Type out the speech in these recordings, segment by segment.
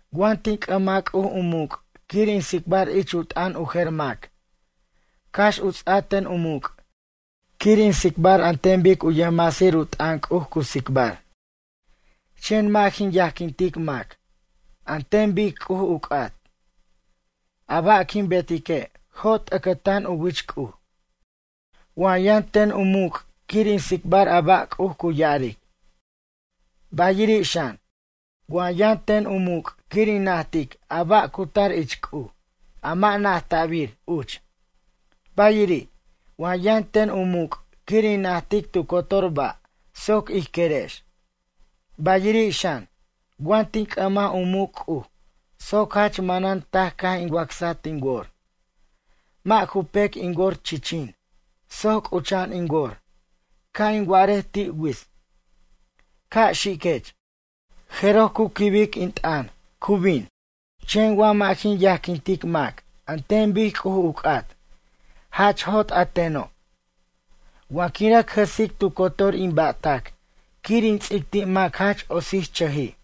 Wa tin c'ʌmaj C'uj u muc' quir in tsicbar ich u t'ʌn u jer mac, cax u ts'a ten u muc' quir in tsicbar an ten bic u yʌjmasir u t'ʌn C'uj cu tsicbar, chen mʌ' jin yajquintic mac, an ten bic C'uj u c'at. A ba' quin betique' jot ʌcʌtan u wich C'uj. Wa yʌn ten u muc' quir in tsicbar a ba' C'uj cu ya'aric. Bayiri' xan, wa yʌn ten u muc' quir in najtic a ba' cu tar ich C'uj, a mʌ' najta'bir uch. Bayiri', wa yʌn ten u muc' quir in najtic tu cotor ba' soc ij querex. Bayiri' xan, wa tin c'ʌmaj u muc' C'uj soc jach manan taj caj in wacsaj tin wor, mʌ' ju pec in wor chichin soc c'ucha'an in wor, ca' in wa'arej ti' wits: “Ca' xiquech”, jeroj cu quibic in t'ʌn, cu bin. Chen wa mʌ' jin yajquintic mac an ten bic C'uj u c'at, jach jot a teno'. Wa quin rʌc jʌsic tu cotor in ba'tac quir in ts'ic ti' mac jach otsichʌjij.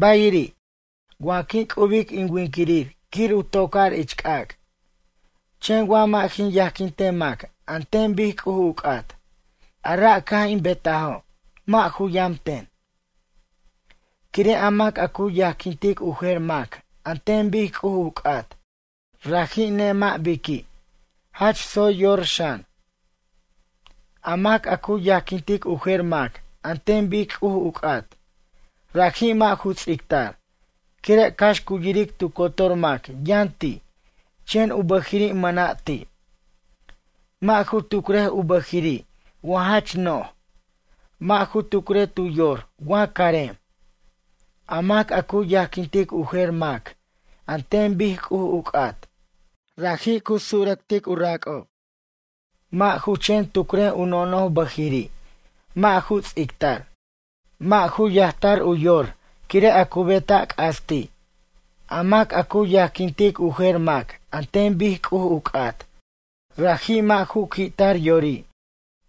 Bayiri', wa quin c'ubic in winquirir quir u toc'ar ich c'ac'. Chen wa mʌ' jin yajquintej mac an ten bic C'uj u c'at, a ra' caj in betajo', mʌ' ju yam ten. Quire' a mac a cu yajquintic u jer mac an ten bic C'uj u c'at, raji' nemʌ' biqui', jach tsoy yor xan. A mac a cu yajquintic u jer mac an ten bic C'uj u c'at, raji' mʌ' ju ts'ictar, quire' cax cu yiric tu cotor mac yʌn ti', chen u bʌjiri' mʌna' ti'. Mʌ' ju tucrej u bʌjiri' wa jach noj, mʌ' ju tucrej tu yor wa carem. A mac a cu yajquintic u jer mac an ten bic C'uj u c'at, raji' cu surʌctic u rac'ob, mʌ' ju chen tucr u nonoj bʌjiri', mʌ' ju ts'ictar, mʌ' ju yajtar u yor quire' a cu beta' c'as ti'. A mac a cu yajquintic u jer mac an ten bic C'uj u c'at, raji' mʌ' ju qui'tar yori'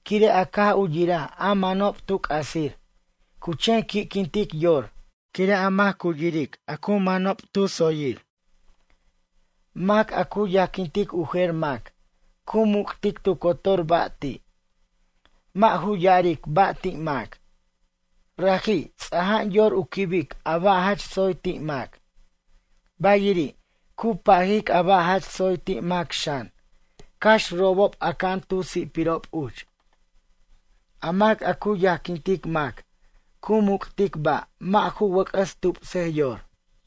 quire' a caj u yiraj a manob tu c'asir, cu chen qui'quintic yor quire' a mac cu yiric a ju manob tu tsoyir. Mac a cu yajquintic u jer mac, cu muc'tic tu cotor ba' ti'. Mʌ' ju ya'aric ba' ti' mac. Raji', ts'aja'an yor u quibic a ba' jach tsoy ti' mac. Bayiri', cu pajic a ba' jach tsoy ti' mac xan, cax robob aca'an tu si'pirob uch. A mac a cu yajquintic mac cu muc'tic ba' mʌ' ju wʌc'ʌs tupsej yor.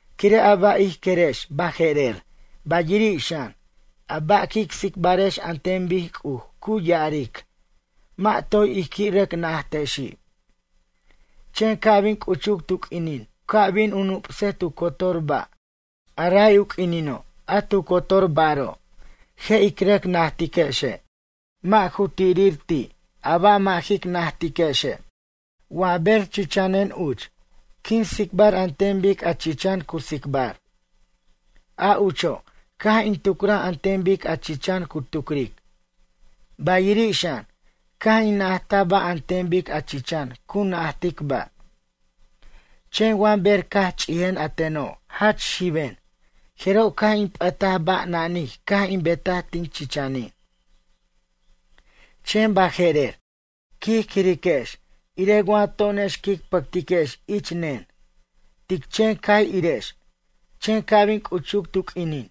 Quire' a ba' ij querex baje'rer, bayiri' xan, a ba' quic tsicbarex an ten bic C'uj cu ya'aric, mʌ' toy ij qui' rʌc najtexi'. Chen ca' bin c'uchuc tu q'uinin u ca' bin u nup'sej tu cotor ba', a ray u q'uinino' a tu cotor baro', je' ic rʌc najtiquexe', mʌ' ju t'irir ti' a ba' mʌ' jic najtiquexe'. Wa ber chichanen uch, quin tsicbar an ten bic a chichan cu tsicbar. A ucho', caj in tucraj an ten bic a chichan cu tucric. Bayiri' xan, caj in najtaj ba' an ten bic a chichan cu najtic ba'. Chen wa ber caj ch'ijen a teno' jach xiben, jeroj caj in p'ʌtaj ba' nanij caj in betaj tin chichanin. Chen baje'rer, quij quiriquex irej wa to'onex quic pʌctiquex ich nen, tic chen cay irex, chen ca' bin c'uchuc tu q'uinin,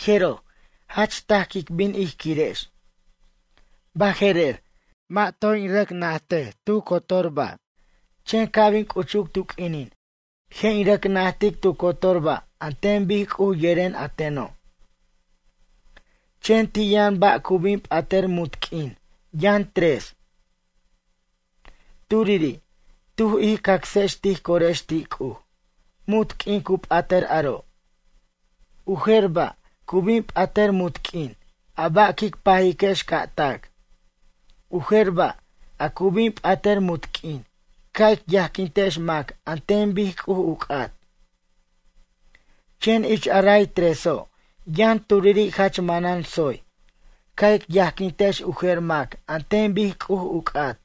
jeroj, jach taj quic bin ij quirex. Bajejer, mʌ' toy in rʌc najtej tu cotor ba', chen ca' bin c'uchuc tu q'uinin, je' in rʌc najtic tu cotor ba' an ten bic C'uj yeren a teno'. Chen ti' yʌn ba' cu bin p'atʌr munt q'uin, yʌn tres. Turiri', tuj ij cacsex tij corex ti' C'uj, munt q'uin cu p'atʌr aro'. U jer ba', cu bin p'atʌr munt q'uin, a ba' quic pajiquex ca' tac. U jer ba', a cu bin p'atʌr munt q'uin, ca' ic yajquintex mac an ten bic C'uj u c'at. Chen ich a ray treso', yʌn turiri' jach manan tsoy, ca' ic yajquintex u jer mac an ten bic C'uj u c'at.